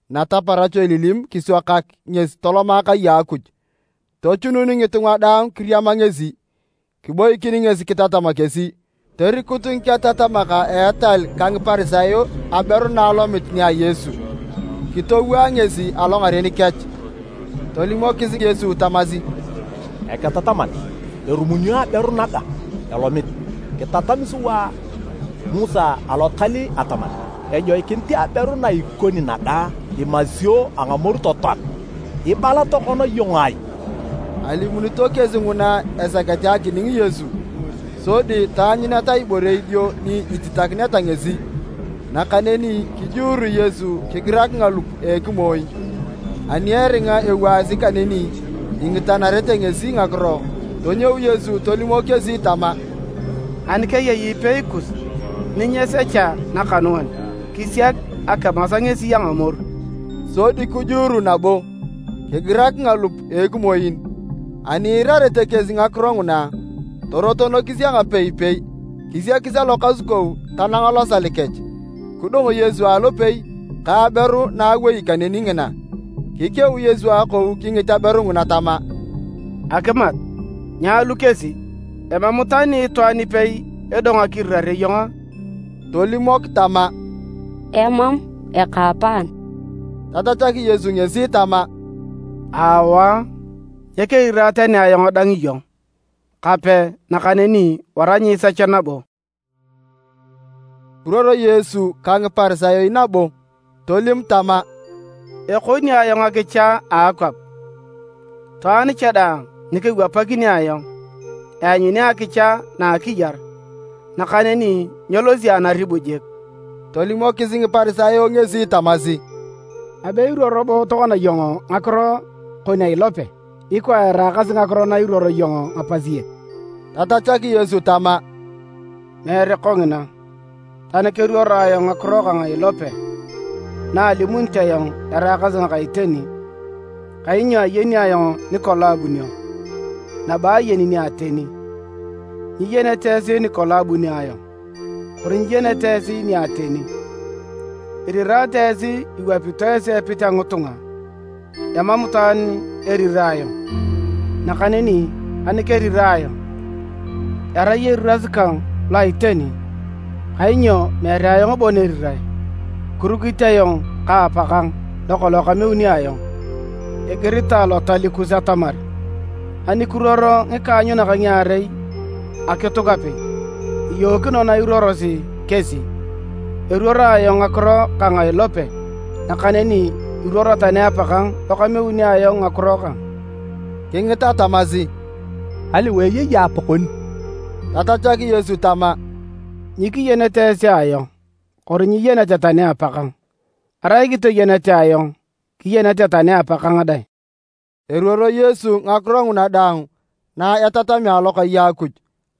Nataparach elilim, kiswakak ngesi toloma kai a Akuj, tochunun ngitunga daang kiriama ngesi. Kiboikin ngesi kitatam kesi. Torikut ngiketatamak a etal ka Ngiparisayo aberu na alomit nia Yesu, kitowaa ngesi alongaren kech. Tolimokis Yesu tamasi, “Eketataman, erumunio aberu naga elomit. Kitatami sua Musa Alotal atamar ejoikinit aberu na ikoni naga imasio a ngamoru totoan. Ibala tokona iyong ai?” Alimunito kesi nguna esakete akining Yesu, sodi taanyuneta ibore idio ni ititakineta ngesi. Nakaneni kijuuru Yesu kigirak ngalup a ekimoin. Ani eringa ewaasi kaneni ingitanarete ngesi ngakiro, tonyou Yesu tolimok kesi tama, “Ani keyei ipei kus ni nyesecha nakanuan, kisiak akimas ngesi a amoru.” Sodi kijuuru nabo, kigirak ngalup a ekimoin. Ani iirarete kesi ngakiro nguna, torotonokis a ngapeipei, kisiakis alokasukou tanang losal kech. Kidong Yesu alopei, ka aberu na awei kaneni ngina. Kikeu Yesu akou kingit aberu ngina tama, “Akimat, nyaalu kesi! Emam tani itwaan ipei edong akirirare iyong a?” Tolimok tama, “Emam, ekaapaan.” Tatachak Yesu ngesi tama, “Aawa, nyekerirae tani ayong dang iyong, kape, nakaneni wara nyiisech nabo.”] Kiruoro Yesu ka Ngiparisayo nabo. Tolim tama, “Ekoni ayong akicha a akwap. Itwaan cha daang nikewapakini ayong, eanyuni akicha na a akiyar, nakaneni nyelosi anaribu jik.” Tolimokis Ngiparisayo ngesi tamasi, “Abe iruoro bo tokona iyong ngakiro kon a ilope, ikwa eraakasi ngakiro na iruoro iyong ngapasiek.” Tatachak Yesu tama, “Meere kongina, tani keruoro ayong ngakiro kang a ilope, na alimunit ayong eraakasi ngaka iteni, kainyo ayeni ayong nikolong abunio, nabo ayeni ni ateni. Nyiyenete esi nikolong abunio ayong, kori nyiyenete ni ateni. Irirate esi iwapito epit a ngitunga, emam itwaan erirae ayong. Nakaneni ani kerirae ayong, erai eriras kang lo a iteni, kainyo meere ayong bon erirae, kirukit ayong ka Apakang lokolong kameuni ayong. Igiritae Lotal kus atamar anikiruor ngikaanyunak ngiarei akituk apei, iyookino na iruorosi kesi. Eruoro ayong ngakiro kang a ilope, nakaneni iruoro tani Apakang lokameuni ayong ngakiro kang.” Kingita tamasi, “Aliwae eyei Apakon?” Tatachak Yesu tama, “Nyikiyenete esi ayong kori nyiyenete tani Apakang. Arai kitoyenete ayong, kiyenete tani Apakang dang.” Eruoro Yesu ngakiro nguna daang na etatamea alokai a Akuj,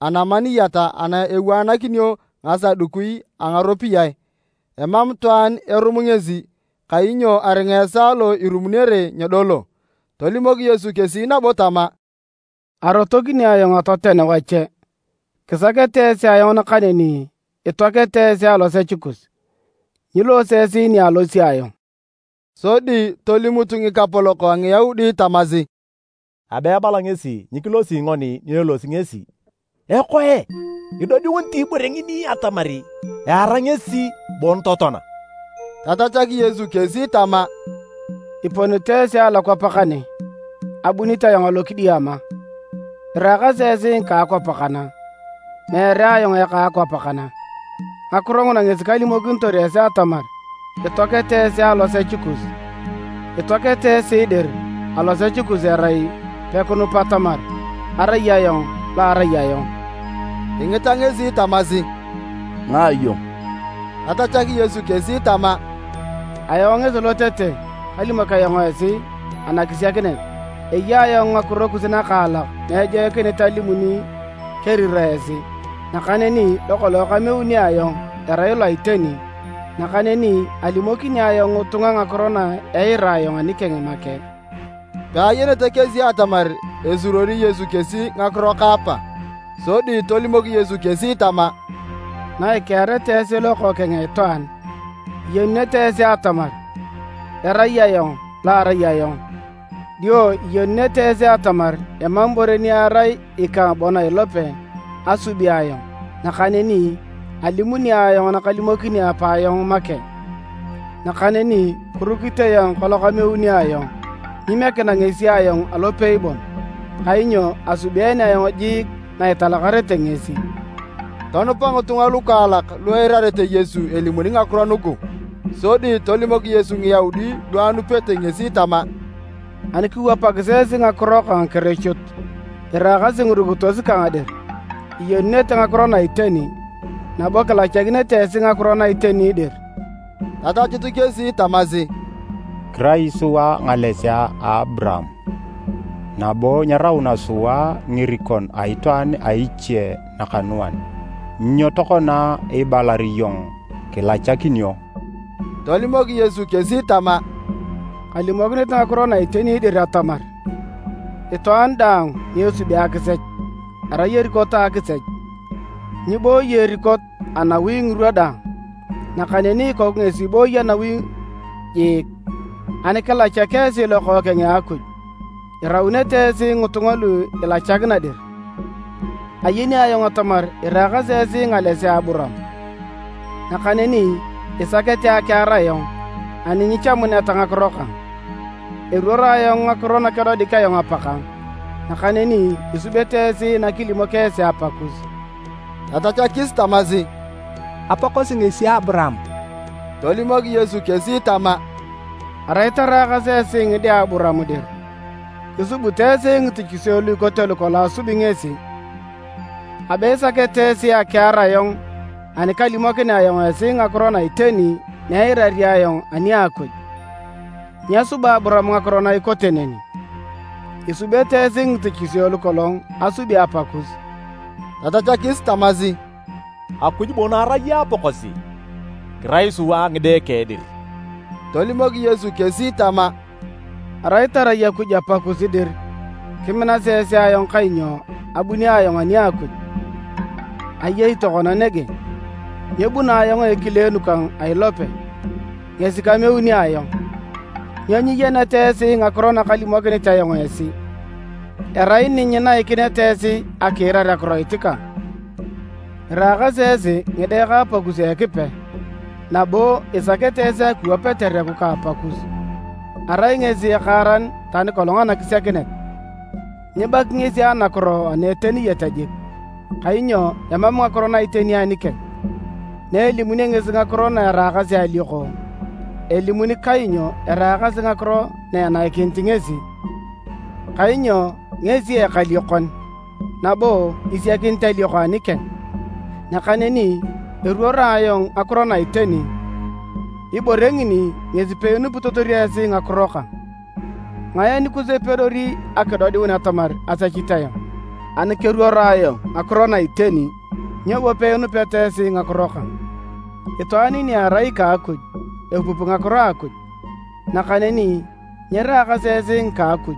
anamaniyat ana ewaanakinio ngasadukui a ngaropiyae. Emam itwaan erum ngesi, kainyo aringa esaa lo irumunere nyedolo. Tolimok Yesu kesi nabo tama, “Arotokini ayong atoten wache. Kisakete esi ayong nakaneni itoakete esi alosech kus. Nyiloose esi ni alosi ayong.” Sodi tolimut ngikapolok a Ngiyaudi tamasi, “Abe ebala ngesi nyikilosi ngoni ni elosi ngesi. Ekoe, idodiunit ibore ngini atamar eara ngesi bon totoan a?” Tatachak Yesu kesi tama, “Iponito esi alokwap kane, abunit ayong alokidiama. Iraakasi esi ngika akwap kana, meere ayong eka akwap kana. Ngakiro nguna ngesi kalimokinitor esi atamar itoakete esi alosech kus. Itoakete esi dir alosech kus erai pekinupa atamar, ‘Arai Ayong Lo arai Ayong.’” Kingita ngesi tamasi, “Ngae iyong?” Tatachak Yesu kesi tama, “Ayong ngesi lotete kalimok ayong esi anakisiakinet. Eya ayong ngakiro kus nakaalak na ejoikinit alimuni keriraa esi. Nakaneni lokolong kameuni ayong erai lo a iteni, nakaneni alimokini ayong ngitunga ngakiro na eira ayong anikeng make.” Peayenete kesi atamar esuruori Yesu kesi ngakiro ka Apa. Sodi tolimok Yesu kesi tama, “Na ikeareta esi Lokookeng a Itwaan, iyenunete esi atamar, ‘Erai Ayong Lo arai Ayong’, dio iyenunete esi atamar emam ibore ni erai ikang bon a ilope asubi ayong nakaneni alimuni ayong nakalimokini Apa ayong make. Nakaneni kirukit ayong ka lokameuni ayong, nyimiekina ngesi ayong alopei bon, kainyo asubeene ayong jiik na italakarete ngesi.” Tonupa ngitunga lukaalak lu eirarete Yesu elimuni ngakiro nugu. Sodi tolimok Yesu Ngiyaudi lu anupete ngesi tama, “Ani kiwapakis esi ngakiro kang kirichut, iraakasi ngirukitos kang dir, iyenunete ngakiro na iteni, nabo kilachakinete esi ngakiro na iteni dir.” Tatachut kesi tamasi, “Kirai sua ngalesea a Aburaam, nabo nyerauna sua ngirikon a itwaan a iche nakanuan. Nyo tokona ibalar iyong, ‘Kilachakinio?’” Tolimok Yesu kesi tama, “Kalimokinit ngakiro na iteni dir atamar, itwaan daang ni esubi akisech, erai erikot a akisech. Nyiiboi erikot anawi ngirwa daang, nakaneni ikoku ngesi ibooyi anawi jiik. Ani kilachak esi Lokookeng a Akuj, iraunete esi ngitunga lu ilachakina dir. Ayeni ayong atamar iraakasi esi ngalesea a Aburaam. Nakaneni isakete akiar ayong ani nyichamuneta ngakiro kang. Eruoro ayong ngakiro nakedodik ayong Apakang, nakaneni isubete esi nakilimok esi apakus.” Tatachakis tamasi, “Apakosi ngesi Aburaam.” Tolimok Yesu kesi tama, “Arai taraakas esi ngide a Aburaam dir, kisubito esi ngitichisio lu ikote lukolong asubi ngesi. Abe isakete esi akiar ayong ani kalimokinea ayong esi ngakiro na iteni na eirari ayong ani a Akuj. Nyesuba Aburaam ngakiro na ikote neni! Isubete esi ngitichisio lukolong asubi apakus.” Tatachakis tamasi, “Akuj bon erai Apakosi, kirai sua ngide keng dir.” Tolimok Yesu kesi tama, “Arai tarai Akuj Apakus dir, kiminasi esi ayong kainyo abuni ayong ani a Akuj, ayei tokona nege. Nyebuno ayong a ekileenu kang a ilope, ngesi kameuni ayong. Nyo nyiyeneta esi ngakiro nakalimokinit ayong esi? Erai ni nyinaikineta esi akiirar akiroit kang. Iraakasi esi ngide ka Apakus Ekipe, nabo isakete esi akiwap etereku ka apakus. Arai ngesi ekaaran tani kolong anakisiakinet, nyibaki ngesi anakiro ana a iteni jik, kainyo emam ngakiro na iteni anikeng. Na elimunio ngesi ngakiro na eraakasi alioko, elimuni kainyo eraakasi ngakiro na enaikinit ngesi, kainyo ngesi ekaliokon, nabo isiakinit alioko anikeng. Nakaneni eruoro ayong ngakiro na iteni, ibore ngini ngesi peinupitotor esi ngakiro kang. Ngae anikus epedori akidodiun atamar asechit ayong? Ani keruoro ayong ngakiro na iteni, nyo bo peinupeta esi ngakiro kang? Itwaan ni erai ika Akuj, epupi ngakiro a Akuj. Nakaneni nyiraakasi esi ngika a Akuj,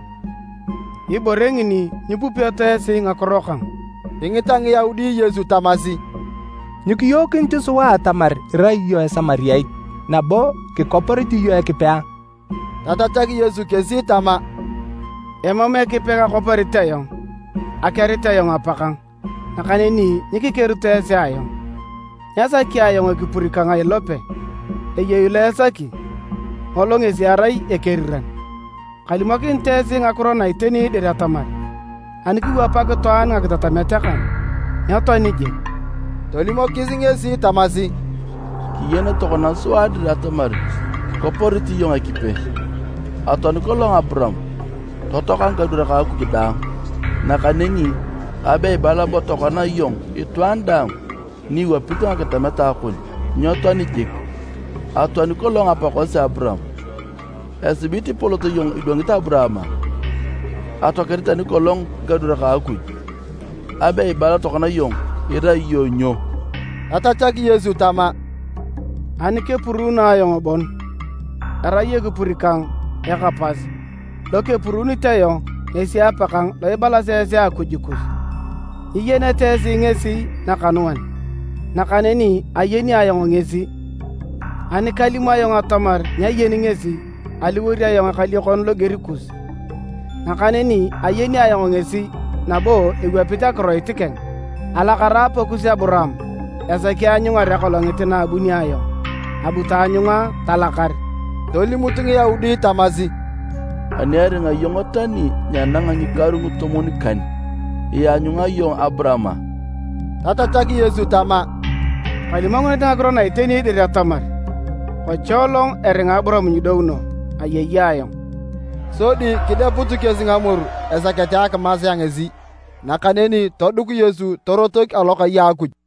ibore ngini nyipupeto esi ngakiro kang.” Kingita Ngiyaudi Yesu tamasi, “Nyikiyookinit sua atamar irai iyong Esamariat, nabo kikoporit iyong Ekipe a?” Tatachak Yesu kesi tama, “Emam Ekipe kakoporit ayong, akerit ayong Apakang, nakaneni nyikikerito esi ayong. Nyasaki ayong ekipur kang a ilope, eyei lo esaki, ngolo ngesi erai ekeriran. Kalimokinit esi ngakiro na iteni dir atamar, ani kiwapak itwaan ngakitatamet kang, nyetoani jik.” Tolimokis ngesi tamasi, “Kiyen tokona sua dir atamar kikoporit iyong Ekipe! Atoani kolong Aburaam, totoaka ngikadwarak a Akuj dang, nakaneni abe ibala bo tokona iyong itwaan daang ni iwapit ngakitatamet kon, nyetoani jik. Atoani kolong apakosi Aburaam. Esibit ipolot iyong idwangit Aburaam a? Atoakete tani kolong ngikadwarak a Akuj. Abe ibala tokona iyong irai iyong nyo?” Tatachak Yesu tama, “Ani kepuruuno ayong bon, erai ekipur kang eka pas, lokepuruunit ayong ngesi Apakang lo ibalasi esi Akuj kus. Nyiyenete esi ngesi nakanuan, nakaneni ayeni ayong ngesi. Anikalimu ayong atamar nyayeni ngesi, aliwor ayong ekaliokon loger kus, nakaneni ayeni ayong ngesi nabo ewapit akiroit keng. Alakara Apakus Aburaam esaki aanyungar akolongit na abunio ayong, abu taanyunga talakar.” Tolimut Ngiyaudi tamasi, “Ani eringa iyong tani nyenanga ngikaru ngitomwon-kan, ianyunga iyong Aburaam a?” Tatachak Yesu tama, “Kalimokinit ngakiro na iteni dir atamar, kocholong eringa Aburaam nyidouno, ‘Ayei Ayong’.” Sodi kideput kesi ngamoru esakete akimasea ngesi, nakaneni toduk Yesu torotok alokai a Akuj.